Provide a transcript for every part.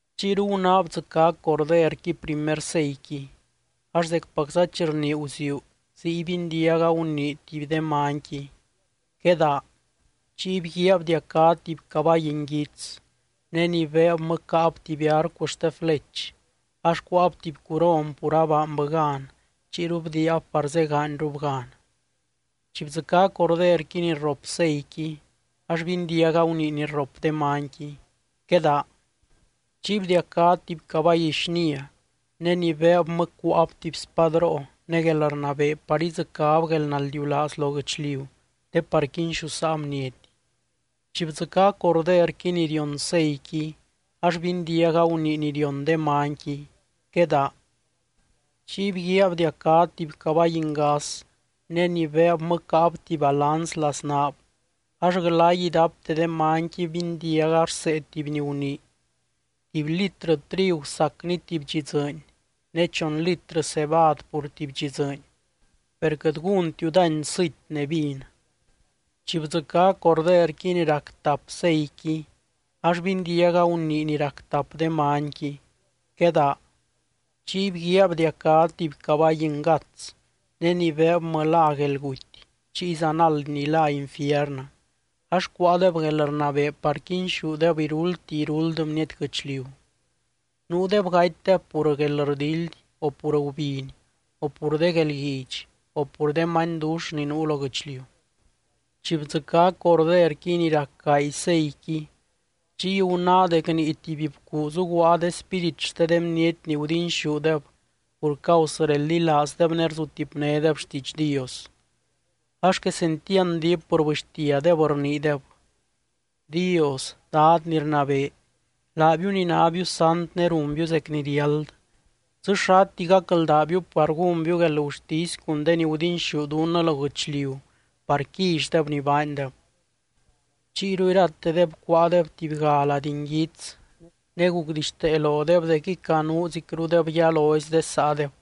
Chiyru gunáa bdzɨcá Corderqui primer seiqui, ax zecpacza chi rnii guziuu ziy bindiaga gunii tuby de manyqui: —¡Quedaa! Chiy bguíaa bdiacá tuby cabay nguits, ne ni beebmɨ caab tuby arcu xte flech. Ax cuáab tuby curon pur abaanbɨ gan, chiyru bdiiab par zegaanyrub gan. Chi bdzɨcá Corderqui ni rrop seiqui ax bindiaga gunii ni rrop de manyqui: —¡Quedaa! Chiy bdiacá tuby cabay xnia, ne ni beebmɨ cuáab tuby spadroo ne guelrnabee par idzɨcáb guelnaldiulaaz lo guɨchliu te par quinxusaa bniety. Chi bdzɨcá Corderqui ni rion seiqui, ax bindiaga gunii ni rion de manyqui: —¡Quedaa! Chiy bguíaa bdiacá tuby cabay ngas, ne ni beebmɨ caab tuby balanz laznaab. Ax glay idapte de manyqui bindiaga rsee tuby ni gunii: —Tuby litrɨ trigu sacni tuby dxi dzɨɨny ne chon litrɨ cebad pur tuby dxi dzɨɨny, per quɨt gúntiu dány sɨty ne vin. Chi bdzɨcá Corderqui ni rac tap seiqui, ax bindiaga gunii ni rac tap de manyqui: —¡Quedaa! Chiy bguíaa bdiacá tuby cabay ngats, ne ni beebmɨ lá Guelguty chiy zanald ni lá Infiernɨ. Ax cuáadeb guelrnabee par quinxúdeb iruldti iruld bniety guɨchliu. Nuudeb gatydeb pur guelrdildy, o pur gubiny, o pur de guelguidx, o pur de manydux ni nuu lo guɨchliu. Chi bdzɨcá Corderqui ni rac gaay seiqui, chiy gunáa dec nii tuby bcuu zuguaa de spírit xte de bniety ni gudinxúdeb pur causɨ reldilaazdeb ne guzutipnédeb xtiidx Dios. Ax quesentiand diip rbɨxtiadeb rniideb: —Dios, Dad ni rnabee, laabiu ni nábiu sant ne runbiu zec ni riáld, ¿dzɨ xati gacldaabiu par gúnbiu guelgurtisy cun de ni gudinxú dunnɨ lo guɨchliu par quillydeb ni baandeb? Chiyru iratedeb cuáadeb tubyga lady nguits, ne gucdixtee lodeb dec icanuzicrudeb yalozi de saadeb,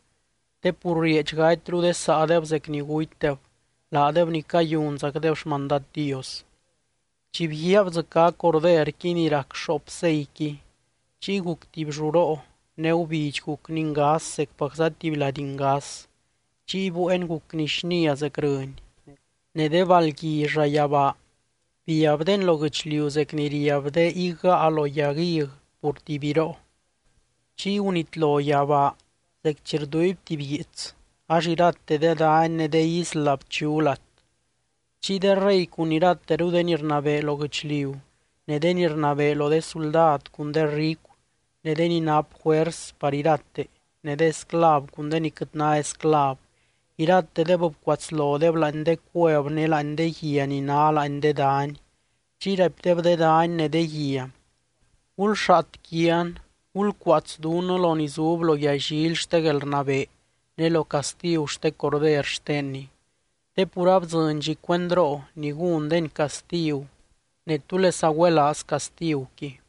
te pur rieedx gatyru de saadeb zec ni gutydeb, laadeb ni cayunzacdeb xmandad Dios. Chi bguíaa bdzɨcá Corderqui ni rac xoop seiqui, chiy guc tuby lluroo ne gubidx gucni ngas zecpacza tuby lady ngas. Chiy bueen gucni xnia zec rɨny, ne de balgui llayabaa biabdeni lo guɨchliu zec ni riab de higgaa lo yag hig pur tuby biroo. Chiy gunitlo yabaa zec chi rduuiby tuby guiits, ax irate de dany ne de isla bchu lat. Chiy de rey cun irateru de ni rnabee lo guɨchliu, ne de ni rnabee lo de suldad cun de ricu, ne de ni nap juers par irate, ne de esclav cun de ni quɨt ná esclav, iratedeb bcuatslodeb láani de cuev ne láani de guia ni ná láani de dany. Chiy raipdeb de dany ne de guia: —Gulxaat quian, gulcuaats dunnɨ lo ni zub lo yallily xte guelrnabee ne lo castigu xte Corder xtenny, te pur abdzɨny dxi cuendroo ni gúndeny castigu ne, ¿túlesa güelaaz castiguqui?